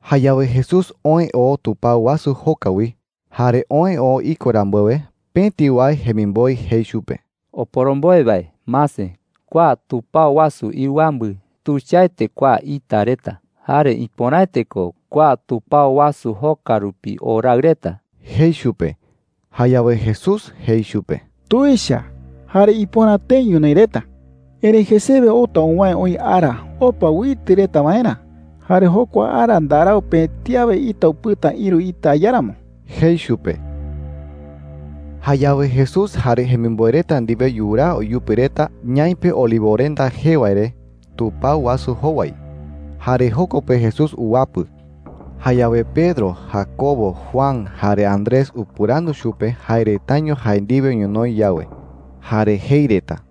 Jayawe Jesús oë oo tupao wasu joka wi. Jare oë oo iko rambuewe, pëti wae jemimboe jei chupe: “Oporomboe wae, mase. Kua tupao wasu iɨwambɨ, ¡tuichaete kua ita reta! Jare ¡ipöraete ko kua tupao wasu joka rupi o raɨ reta!” jei chupe. Jayawe Jesús jei chupe: “Tuicha jare ipöra tëi ñonoï reta,” jei. “Erëi jesewe outa uwäe oï ara opa uitɨ reta waerä. Jare jokua ara ndarau pëti awe ita upɨta ïru ita iáramo,” jei chupe. Jayawe Jesús jare jemimboe reta ndiwe yuraa uyupi reta ñaipe Olivorenda jee wae re tupao wasu jowai, jare joko pe Jesús uwapɨ. Jayawe Pedro, Jacobo, Juan, jare Andrés upɨrandu chupe jae retaño jae ndiwe ñonoï yawe, jare jei reta: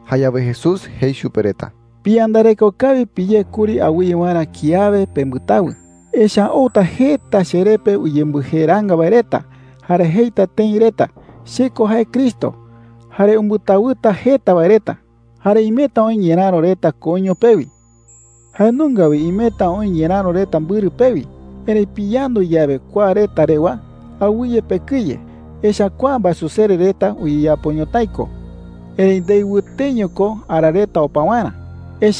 Jayawe Jesús jei chupe reta: “Piyandareko kawi piyé kuri awɨye waerä kiawe pembɨtawɨ,” jei chupe reta. “Echa’ä outa jeta cheree pe uyembɨjeeraanga wae reta. Jare jeita tëi reta: ‘Che ko jae Cristo.’ Jare umbɨtawɨta jeta wae reta,” jei. “Jare imeta oï ñeräro reta koiño pewi. Jae nunga wi imeta oï ñeräro reta mbɨrɨ pewi. Erëi piyandu yawe kua reta rewa, awɨye pekɨye. Echa’ä kua mbaesusere reta uyeyapo ñotái ko. Erëi ndei wɨteño ko ara reta opa waerä,” jei.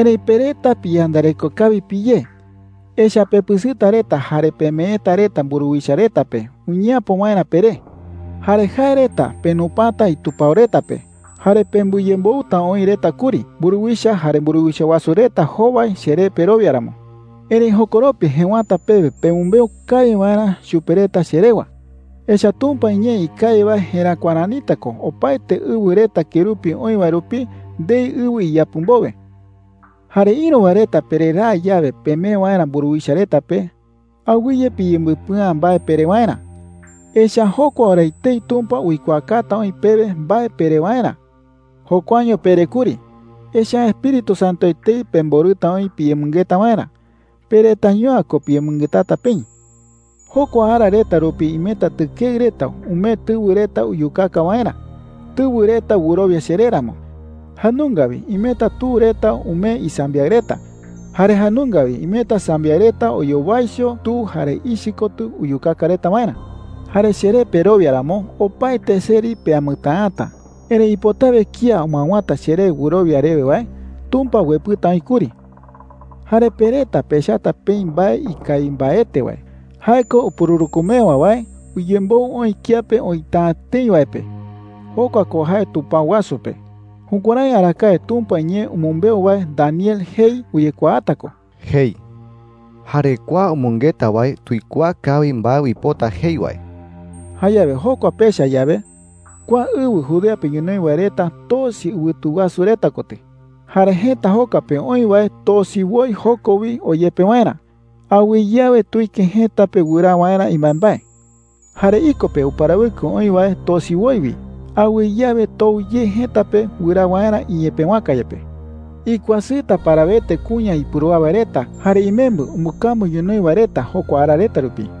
“Erëi pe reta piyandareko kawi piyé. Echa’ä pepɨsɨta reta jare pemeeta reta mburuwicha reta pe uñeapo waerä peré,” jei. “Jare jae reta penupata itupao reta pe. Jare pembɨyemboɨta oï reta kuri mburuwicha jare mburuwicha wasu reta jowai cheré perowia ramo,” jei. “Erëi jokoropi jëwata pewe pemɨmbeu kawi waerä chupe reta che rewa. Echa’ä Tumpa iñee ikawi wae jeräkua ranita ko opaete ɨwɨ reta kerupi oï wae rupi ndei ɨwɨ iyapɨ mbowe,” jei chupe reta. “Jare ïru wae reta pereraa yawe pemee waerä mburuwicha reta pe, awɨye piyembɨpɨa’ä mbae pere waerä. Echa’ä jokua ora etei Tumpa uikuaakata oï pewe mbae pere waerä. Jokuaño pere kuri, echa’ä Espíritu Santo etei pemborɨta oï piyemɨngeta waerä. Pe retaiño’ä ko piyemɨngetata peï,” jei chupe reta. “Jokua ara reta rupi imeta tɨkeɨ reta umee tɨwɨ reta uyukaka waerä, tɨwɨ reta wɨrowia cheré ramo. Jae nunga wi imeta tu reta umee isambiaɨ reta. Jare jae nunga wi imeta sambiaɨ reta oyowaicho tu jare ichɨ kotɨ uyukaka reta waerä,” jei. “Jare cheré perowia ramo, opaete seri peamɨtäata. Erëi ipotawe kía umɨawäta cheré wɨrowia rewe wae, Tumpa uepɨta oï kuri,” jei chupe reta. “Jare pe reta pechata peï mbae ikawi mbaete wae – jae ko upururükumewa wae uyemboɨ oï kiape oïta’ä tëi wae pe. Jokua ko jae tupao wasu pe. Jukuärái arakae Tumpa iñee umɨmbeu wae Daniel jei uyekuaata ko,” jei. (Jare kua umɨngeta wae tuikuaa kawi mbae uipota jei wae.) “Jayawe jokua pecha yawe, kua ɨwɨ Judea pe ñonoï wae reta tosi ɨwɨtu wasu reta kotɨ,” jei. “Jare jëta joka pe oï wae tosi woi joko wi oyepe waerä. Awɨye awe tuike jëta pe wɨraa waerä imbaembae. Jare iko pe uparawɨkɨ oï wae tosi woi wi. Awɨye awe tou ye jëta pe wɨraa waerä iñepëwaka yepe,” jei chupe reta. “¡Ikuasɨta parawete kuña ipurúa wae reta jare imembɨ umbɨkambu ñonoï wae reta jokua ara reta rupi!” jei.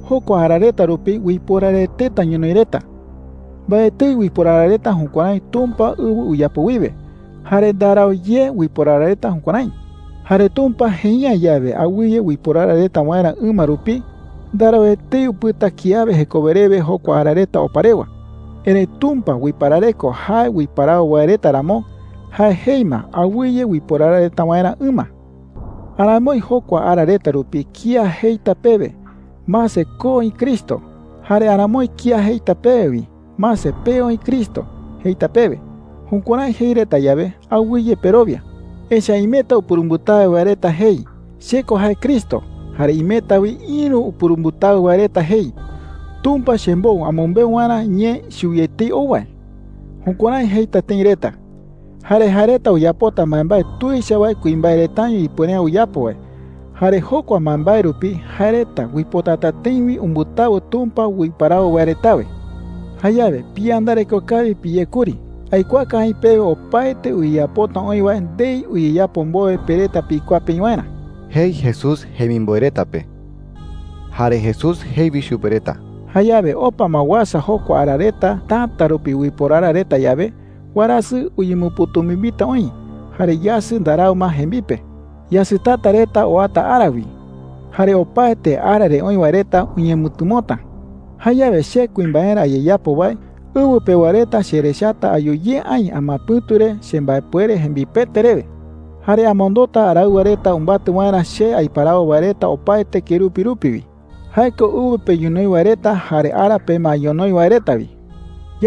“Jokua ara reta rupi uiporaraeteta ñonoï reta. Mbaetɨi uiporara reta jukuärái Tumpa ɨwɨ uyapo wiwe, jare ndarau ye uiporara reta jukuärái,” jei. “Jare Tumpa jei’ä yawe awɨye uiporara reta waerä ɨma rupi, ndarau etei upɨta kiawe jekowe rewe jokua ara reta opa rewa. Erëi Tumpa uiparareko jae uiparawo wae reta ramo, jae jei ma awɨye uiporara reta waerä ɨma,” jei chupe reta. “Aramoi jokua ara reta rupi kía jeita pewe, ‘Mase, ko oï Cristo.’ Jare aramoi kía jeita pewe wi, ‘Mase, pee oï Cristo,’ jeita pewe. Jukuärái jei reta yawe, awɨye perowia,” jei. “Echa’ä imeta upurumbɨtawɨ wae reta jei, ‘Che ko jae Cristo,’ jare imeta wi ïru upurumbɨtawɨ wae reta jei, ‘Tumpa chembou amɨmbeu waerä ñee chuwi etei ou wae.’ Jukuärái jeita tëi reta. Jare jae reta uyapota mbaembae tuicha wae kuimbae retaño ipuere’ä uyapo wae. Jare jokua mbaembae rupi jae reta uipotata tëi wi umbɨtawɨ Tumpa uiparawo wae retawe,” jei. “Jayawe piyandareko kawi piyé kuri. Aikuaaka aï pewe opaete uyeyapota oï wae ndei uyeyapo mbowe pe reta pikuaa peï waerä,” jei Jesús jemimboe reta pe. Jare Jesús jei wi chupe reta: “Jayawe opa ma uasa jokua ara reta täta rupi uiporara reta yawe, warasɨ uñemɨpɨ̈tumimbita oï, jare yasɨ ndarau ma jembipe. Yasɨtata reta oata ara wi, jare opaete ara re oï wae reta uñemɨtɨmota,” jei chupe reta. “Jayawe che kuimbaerä ayeyapo wae, ɨwɨ pewa reta cherechata ayu ye aï amapɨ̈tu re chembaepuere jembipete rewe,” jei. “Jare amondota araɨwa reta umbatɨ waerä che aiparawo wae reta opaete kerupi rupi wi – jae ko ɨwɨ pe ñonoï wae reta jare ara pe ma ñonoï wae reta wi,” jei chupe reta.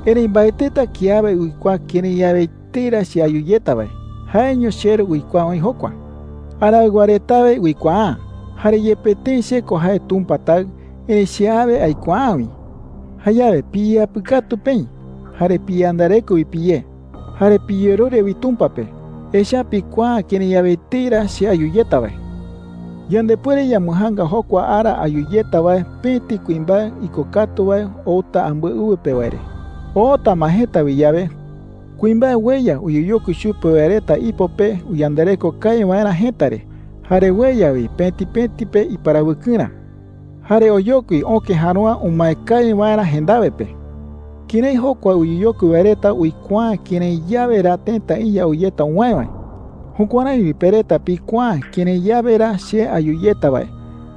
“Erëi mbaetɨta kiawe uikuaa kërái yawe etei ra che ayu yeta wae. Jaeño cheRu uikuaa oï jokua,” jei. “Araɨwa retawe uikuaa’ä. Jare yepe tëi che ko jae Tumpa Taɨ, erëi che awe aikuaa’ä wi,” jei. “Jayawe piyeyapɨkatu peï, jare piyandareko wi piyé, jare piyerure wi Tumpa pe. Echa’ä pikuaa’ä kërái yawe etei ra che ayu yeta wae,” jei chupe reta. “Yandepuere yambɨjaanga jokua ara ayu yeta wae pëti kuimbae ikokatu wae oota ambɨe ɨwɨ pe wae re,” jei. “Oota ma jëta wi yawe, kuimbae ueya uyeyokui chupe wae reta ipo pe uyandareko kawi waerä jëta re, jare ueya wi pëti pëti pe iparawɨkɨrä. Jare oyokui öke järoa umae kawi waerä jendawe pe,” jei. “Kërái jokua uyeyokui wae reta uikuaa’ä kërái yawe ra tëta iya ou yeta uwäe wae, jukuärái wi pe reta pikuaa’ä kërái yawe ra che ayu yeta wae.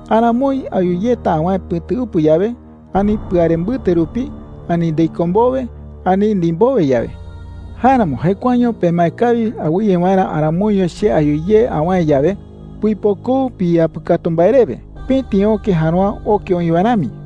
Aramoi ayu yeta awäe pɨ̈tuɨpɨ yawe, ani pɨare mbɨte rupi, ani ndei köe mbowe, ani ndimbowe yawe,” jei. “Jáeramo jekuaeño pemae kawi awɨye waerä aramoiño che ayu ye awäe yawe, puipokou piyeyapɨkatu mbae rewe, pëti öke järoa oke oï wae rami,” jei.